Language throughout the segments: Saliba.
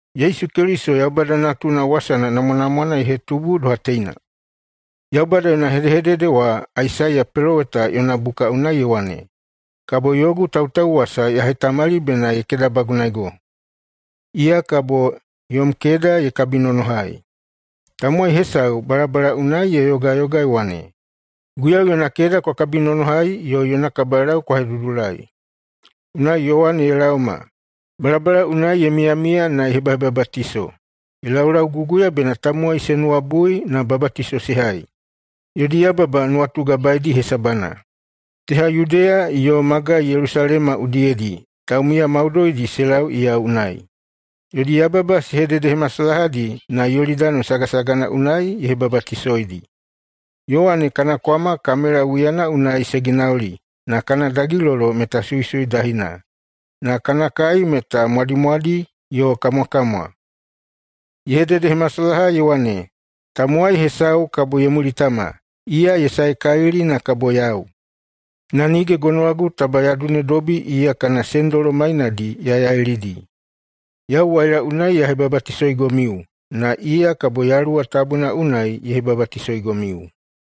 Yesu Keliso Yaubada Natuna wasana namwanamwana ye hetubu doha teina: Yaubada yona hedehedede wa Aisaiya peloweta yona buka unai, ye wane, “Kabo yogu tautauwasa ya hetamali bena ye kedabagunaego. Iya kabo yom keda ye kabinonohai.” “Tamowai hesau balabala unai ye yogayoga ye wane, ‘Guiyau yona keda kwa kabinonohai, yo yona kabalau kwa hedudulai!’” Unai Yowane ye laoma. Balabala unai ye miyamiya na ye hebahebabatiso. Ye laulauguguya bena tamowai se nuwabui na babatiso se hai, yodi yababa nuwatugabaedi hesabana. Teha Yudeya yo magai Yelusalema udiyedi taumiya maudoidi se lau iya unai. Yodi yababa se hededehemasalahadi na Yolidani sagasagana unai ye hebabatisoidi. Yowane kana kwama kamela wiyana unai se ginauli na kana dagilolo meta suisui dahina. Na kana kai meta mwadimwadi yo kamwakamwa. Ye hededehemasalaha ye wane, “Tamowai hesau kabo ye mulitama. Iya ye saekalili na kabo yau. Na nige gonowagu taba ya dunedobi iya kana sendolo mainadi ya yailidi. Yau waila unai ya hebabatisoigomiu, na iya kabo Yaluwa Tabuna unai ye hebabatisoigomiu.”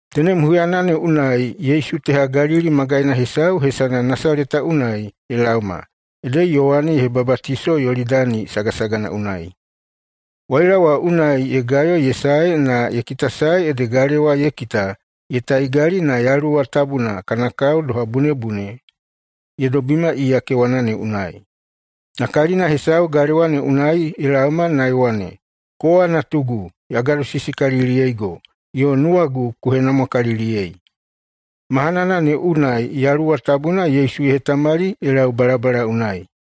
Tenem huyana ne unai Yesu teha Galili magaina hesau hesana Nasaleta unai ye laoma ede Yowane ye hebabatisoi Yolidani sagasagana unai. Waila wa unai ye gayo ye sae na ye kitasae ede galewa ye kita ye taigali, na Yaluwa Tabuna kana kao doha bunebune ye dobima iya kewana ne unai. Na kalina hesau galewa ne unai ye laoma na ye wane, “Kowa Natugu! Ya gadosisikaliliyeigo, yo nuwagu ku henamwakaliliyei!” Mahanana ne unai Yaluwa Tabuna Yesu ye hetamali ye lau balabala unai.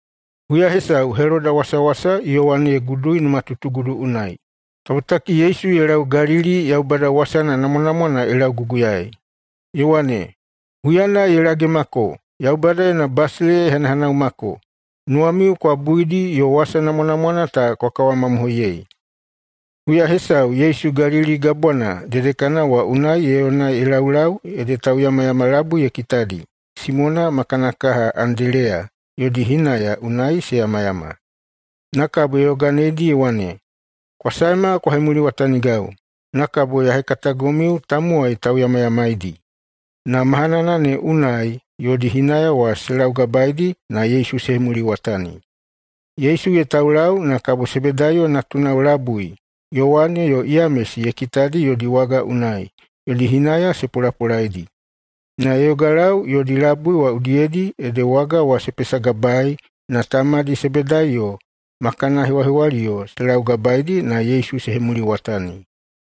Huya hesau Heloda wasawasa Yowane ye gudui numatutugudu unai. Kabotaki Yesu ye lau Galili na Yaubada wasana namwanamwana ye lauguguyaei, ye wane, “Huyana ye lagemako, Yaubada yona basileiya ye hanahanaumako. Nuwamiu kwa buidi yo wasa namwanamwana ta kwa kawamamohoiyei.” Huya hesau Yesu Galili Gabwana dedekana wa unai ye yona ye laulau ede tauyamayama labui ye kitadi, Simona ma kana kaha Andeleya, yodi hinaya unai se yamayama. Na kabo ye yoganeidi ye wane, “Kwa saema kwa hemuliwatanigau, na kabo ya hekatagomiu tamowai tauyamayamaidi.” Na mahanana ne unai yodi hinaya wa se laugabaeidi na Yesu se hemuliwatani. Yesu ye taulau na kabo Sebedaiyo natunao labui Yowane yo Yamesi ye kitadi yodi waga unai yodi hinaya se polapolaidi. Na ye yogalau yodi labui wa udiyedi ede waga wa se pesagabaei na tamadi Sebedaiyo ma kana hewahewaliyo se laugabaeidi na Yesu se hemuliwatani.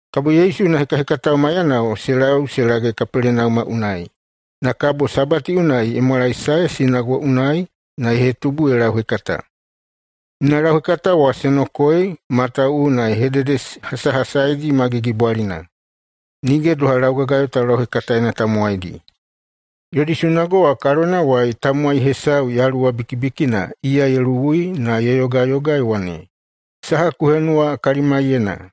Kabo Yesu yona hekahekatao maiyanao se lau se lage Kapelenauma unai, na kabo Sabati unai ye mwalaesae sunago unai na ye hetubu ye lauhekata. Yona lauhekata wa se nokoei, matawuwuna ye hededehasahasaidi ma gigibwalina, nige doha laugagayo taulauhekataena tamowaidi. Yodi sunago wa kalonawai tamowai hesau yaluwa bikibikina iya ye luwui na ye yogayoga ye wane, “Saha ku henuwa kalimaiyena,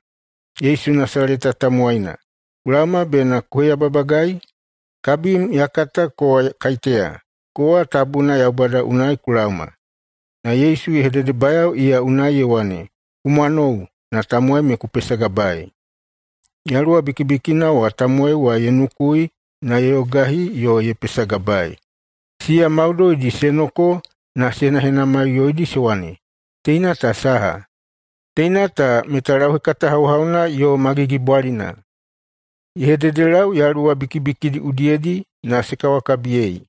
Yesu Nasaleta tamowaina? Ku laoma bena ku heyababagai? Kabim ya kata kowa kaiteya: Kowa Tabuna Yaubada unai ku laoma.” Na Yesu ye hededebayao iya unai ye wane, “Ku mwanou na tamowai me ku pesagabaei!” Yaluwa bikibikina wa tamowai wa ye nukui na ye yogahi yo ye pesagabaei. Siya maudoidi se noko na se henahenamaiꞌuyoidi se wane, “Teina ta saha? Teina ta meta lauhekata hauhauna yo ma gigibwalina! Ye hededelau yaluwa bikibikidi udiyedi, na se kawakabiyei!”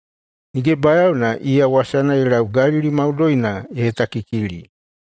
Nige bayaona iya wasana ye lau Galili maudoina ye hetakikili.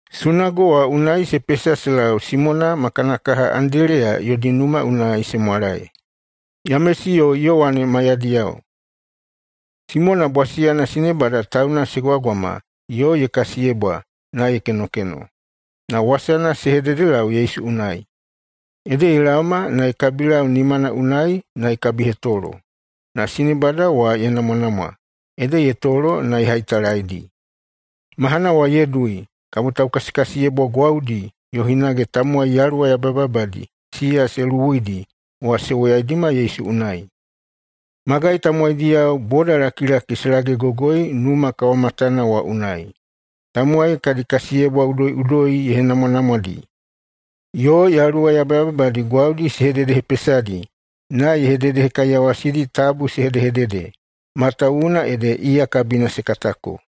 Sunago wa unai se pesa se lau Simona ma kana kaha Andeleya yodi numa unai se mwalae, Yamesi yo Yowane maiyadiyao. Simona bwasiyana sinebada tauna se gwagwama yo ye kasiyebwa na ye kenokeno, na wasana se hededelau Yesu unai. Ede ye laoma na ye kabilau nimana unai na ye kabihetolo. Na sinebada wa ye namwanamwa, ede ye tolo na ye haitalaidi. Mahana wa ye dui kabo taukasikasiyebwa gwaudi yo hinage tamowai yaluwa yabayababadi siya se luwuidi wa se woyaidima Yesu unai. Magai tamowaidiyao bodalakilaki se lagegogoi numa kawamatana wa unai. Tamowai kadi kasiyebwa udoiꞌudoi ye henamwanamwadi. Yo yaluwa yabayababadi gwaudi ye hededehepesadi na ye hededehekaiyawasidi tabu se hedehedede, matawuwuna ede iya kabina se katako.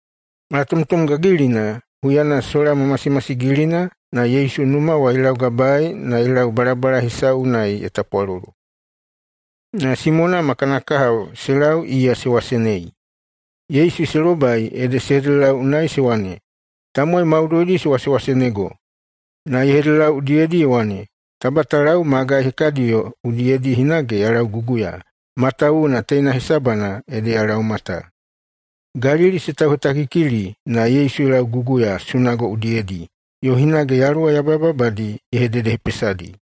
Malatomtom gagilina, huyana sola ma masimasigilina, na Yesu numa wa ye laugabaei na ye lau balabala hesau unai ye tapwalolo. Na Simona ma kana kahao se lau iya se wasenei. Yesu se lobai ede se hededelau unai se wane, “Tamowai maudoidi se wasewaseneigo!” Na ye hededelau udiyedi ye wane, “Taba ta lau magai hekadiyo udiyedi hinage ya lauguguya, matawuwuna teina hesabana ede ya laoma ta.” Galili se tauhetakikili na Yesu ye lauguguya sunago udiyedi, yo hinage yaluwa yabayababadi ye hededehepesadi.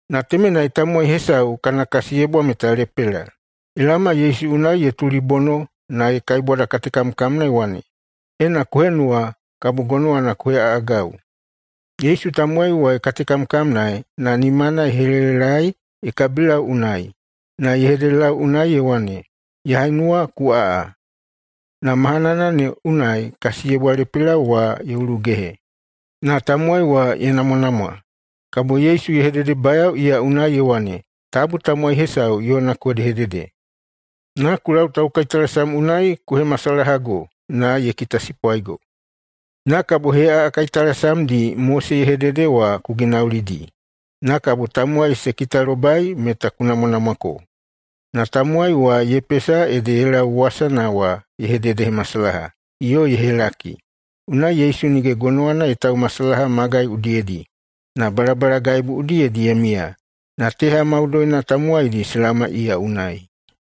Na temenai tamowai hesau kana kasiyebwa meta lepela. Ye laoma Yesu unai ye tulibono na ye kaibwadakatekamkamna ye wane, “Ena ku henuwa, kabo gonowana ku heꞌaꞌagau.” Yesu tamowai wa ye katekamkamnaei na nimana ye helelelaei ye kabilau unai, na ye hededelau unai ye wane, “Ya henuwa, ku aꞌa.” Na mahanana ne unai kasiyebwa lepela wa ye ulugehe na tamowai wa ye namwanamwa. Kabo Yesu ye hededebayao iya unai ye wane, “Tabu tamowai hesau yona ku hedehedede. Na ku lau taukaitalasam unai ku hemasalahago na ye kitasipwaigo. Na kabo heꞌaꞌa kaitalasamdi Mose ye hedede wa ku ginaulidi, na kabo tamowai se kitalobai meta ku namwanamwako.” Na tamowai wa ye pesa ede ye lau wasana wa ye hededehemasalaha yo ye helaki. Unai Yesu nige gonowana ye taumasalaha magai udiyedi, na balabalagaibu udiyedi ye miya. Na teha maudoina tamowaidi se laoma iya unai.